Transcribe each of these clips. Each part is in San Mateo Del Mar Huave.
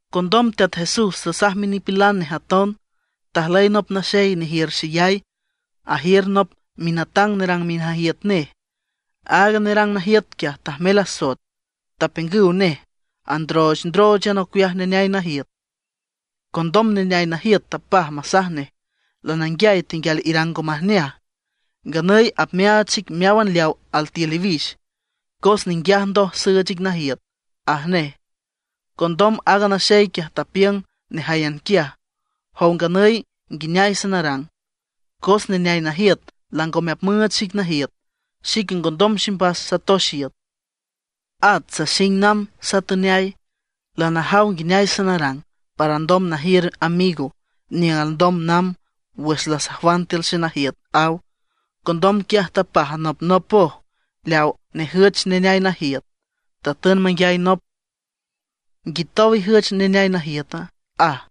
Condom Teat Jesús tasaj minipilan nej aton: ―Tajlüy nop naxey nejiür xeyay, ajiür nop minatang nerang minajiüt nej. Aaga nerang najiüt quiaj tajmel asoet; tapiüngüw nej androochndróochan ocueaj neneay najiüt. Condom neneay najiüt tapaj masaj nej: “Lananguiay tenguial irang ngo majneaj. Nganüy apmeaach xic meáwan leaw altiül iwix, cos ninguiaj ndoj süüch ic najiüt”, aj nej. Condom aaga naxey quiaj tapiüng nejáyan quiaj: “Jow nganüy nguineay sanarang, cos neneay najiüt langome apmüüch xic najiüt. Xique ngondom ximbas satox iüt; at saxing namb satüneay. Lanajaw nguineay sanarang para alndom najiür amigo niüng alndom namb wüx lasajwan tiül xenajiüt”, aw. Condom quiaj tapaj anopnopoj leawa nejüch neneay najiüt. Tatün manguiay nop: “¿Nguitow ijüch neneay najiüta?”, aj.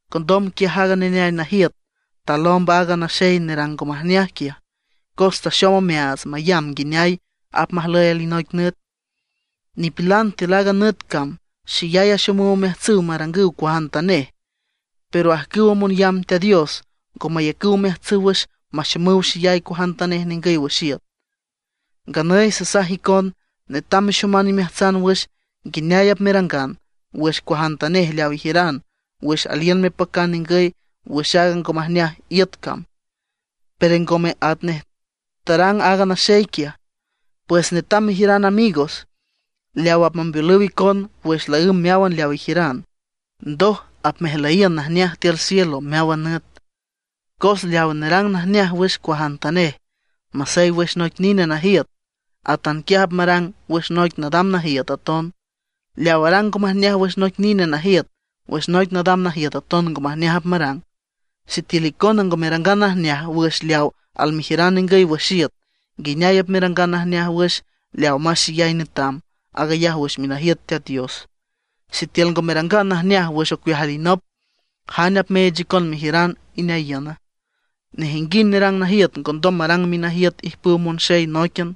Condom quiaj aaga neneay najiüt talomb aaga naxey nerang ngo majneaj quiaj cos taxom omeaats mayamb nguineay apmajlüy alinoic nüt. Nipilan tiül aaga nüt cam xeyay axomüw omeajtsüw marangüw cuajantanej. Pero ajcüw monyamb Teat Dios ngo mayacüw omeajtsüw wüx maxomüw xeyay cuajantanej ningüy wüx iüt. ’Nganüy sasaj icon: Netam mexoman imeajtsan wüx nguineay apmerangan wüx cuajantanej leaw ijiüran wüx aliün mepacan ningüy wüx aaga ngo majneaj iüt cam, pero ngome atnej tarang aaga naxey quiaj. Pues netam mejiüran amigos leaw apmambeolüw icon wüx laǘmb meáwan leaw ijiüran. Ndoj apmejlüyiün najneaj tiül cielo meáwan nüt. ’Cos leaw nerang najneaj wüx cuajantanej, masey wüx noic nine najiüt, atanquiaj apmarang wüx noic nadam najiüt aton. Leaw arang ngo majneaj wüx noic nine najiüt, wüx noic nadam najiüt aton ngo majneaj apmarang. Sitiül icona ngo merangan najneaj wüx leaw almejiüran ningüy wüx iüt, ¿nguineay apmerangan najneaj wüx leawa más xeyay netam, aag ayaj wüx minajiüt Teat Dios? Sitiül ngo merangan najneaj wüx ocueaj alinop, ¿jane apmeech icon mejiüran ineayiüna? ’Nejinguind nerang najiüt ngondom marang minajiüt ijpüw monxey nóiquian,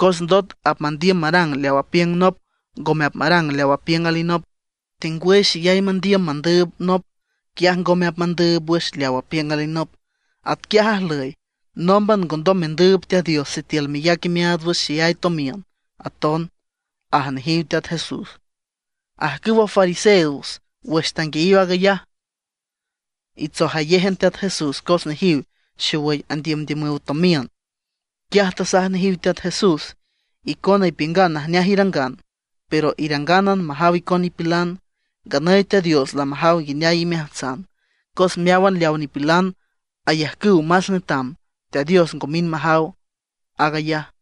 cos ndot apmandiüm marang leaw apiüng nop, ngome apmarang leaw apiüng alinop. Tengwüy xeyay mandiüm mandüüb nop, quiaj ngome apmandüüb wüx leaw apiüng alinop. Atquiaj ajlüy, nómban ngondom mendüüb Teat Dios sitiül meyac imeaats wüx xeyay tomiün aton ―aj nejiw Teat Jesús. Ajcüwa fariseos wüx tanguiayiw aag ayaj, itsojayéjan Teat Jesús cos nejiw xowüy andiümdiümüw tomiün. Quiaj tasaj nejiw Teat Jesús: ―Icona ipiüngan najneaj irangan, pero irangánan majaw icon nipilan. Nganüy Teat Dios lamajaw nguineay imeajtsan. Cos meáwan leawa nipilan ayajcüw más netam, Teat Dios ngo mind majaw aag ayaj.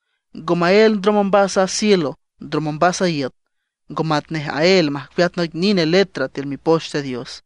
’Ngo maél ndrom ombas a cielo ndrom ombas a iüt, ngo matnej aél majcueat noic nine letra tiül Mipoch Teat Dios.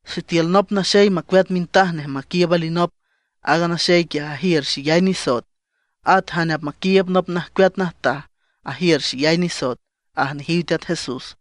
’Sitiül nop naxey macueat mintaj nej maquiiüb alinop, aaga naxey quiaj ajiür xeyay nisoet. At jane apmaquiiüb nop najcueat najtaj ajiür xeyay nisoet ―aj nejiw Teat Jesús.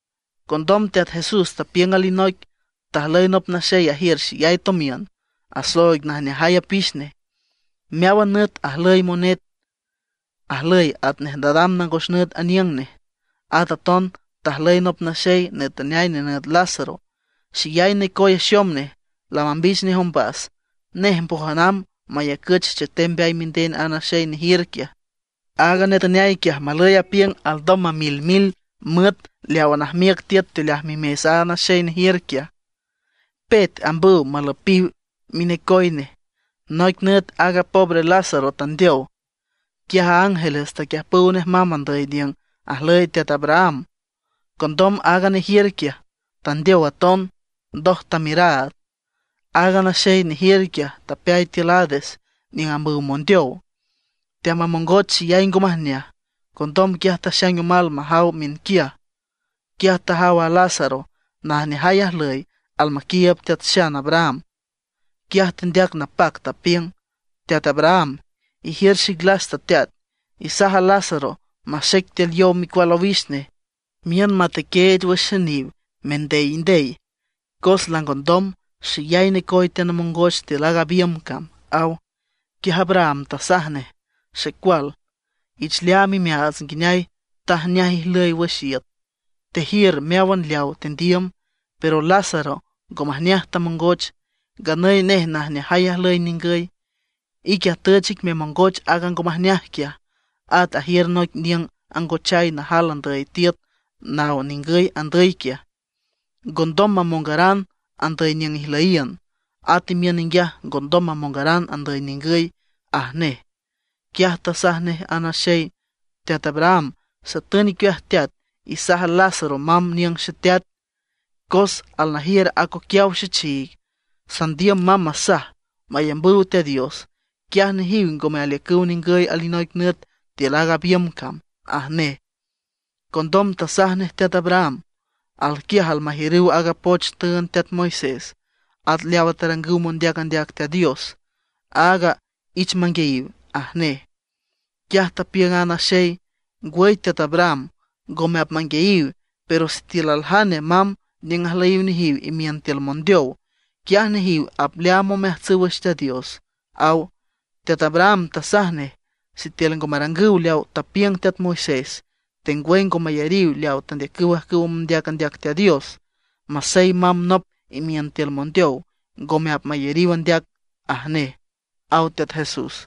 Condom Teat Jesús tapiüng alinoic: ―Tajlüy nop naxey ajiür xeyay tomiün, asooig najneajay apix nej. Meáwan nüt ajlüy monet, ajlüy atnej nadam nangos nüt aniüng nej. At aton tajlüy nop naxey netüneay nenüt Lázaro. Xeyay necoy axom nej, lamambich nej ombas. Nej mbójan amb mayacüch chetem mbeay minden a naxey nejiür quiaj. Aaga netüneay quiaj malüy apiüng alndom mamilmil müet leawa najmiüc tiüt teoleaj mimes a naxey nejiür quiaj. Pet ambüw malüpiw minecoy nej. Noic nüt aaga pobre Lázaro tandeow. Quiaj ángeles taquiüjpüw nej mamb andüy niüng ajlüy teat Abraham. Condom aaga nejiür quiaj, tandeow aton, ndoj tamiüraad. Aaga naxey nejiür quiaj tapeay tiül Hades niüng ambüw mondeow, teamamongoch xeyay ngo majneaj. Condom quiaj taxaing omal majaw miünquiaj; quiaj tajaw a Lázaro najneajay ajlüy almaquiiüb Teat Xan Abraham. Quiaj tendeac napac tapiüng: “¡Teat Abraham, ijiür xic lasta teat! Isaj a Lázaro maxec tiül yow micual owix nej, miün matequeech wüx xeniw mendeyndey, cos langondom, xeyay necoy teanamongoch tiül aaga biümb cam”, aw. Quiaj Abraham tasaj nej: “Xecual, ich leaam imeaats nguineay tajneaj ijlüy wüx iüt, tejiür meáwan leawa tendiüm; pero a Lázaro ngo majneaj tamongoch. Nganüy nej najneajay ajlüy ningüy, ique atüch ic memongoch aaga ngo majneaj quiaj. At ajiür noic niüng angochay najal andüy tiüt naw ningüy andüy quiaj, ngondom mamongaran andüy niüng ijlüyiün; at imiün ninguiaj ngondom mamongaran andüy ningüy”, aj nej. Quiaj tasaj nej a naxey: “Teat Abraham, satün icueaj teat, isaj a Lázaro mamb aniüng xeteat. Cos alnajiür acoquiaw xechiig, sandiüm mamb masaj mayambüw Teat Dios; quiaj nejiw ngome aliücüw ningüy alinoic nüt tiül aaga biümb cam”, aj nej. Condom tasaj nej teat Abraham: “Alquiaj almajiürüw aaga poch tüünd teat Moisés, at leawa tarangüw mondeac andeac Teat Dios. Áag ich manguiayiw”, aj nej. Quiaj tapiüng a naxey: “Ngwüy Teat Abraham, ngome apmanguiayiw. Pero sitiül aljane mamb niüng ajlüyiw nejiw imiün tiül mondeow, quiaj nejiw apleaam omeajtsüw wüx Teat Dios”, aw. Teat Abraham tasaj nej: “Sitiül ngo marangüw leawa tapiüng teat Moisés, tengwüy ngo mayariw leawa tandeacüw ajcüwa mondeac andeac Teat Dios, masey mamb nop imiün tiül mondeow ngome apmayariw andeac”, aj nej ―aw Teat Jesús.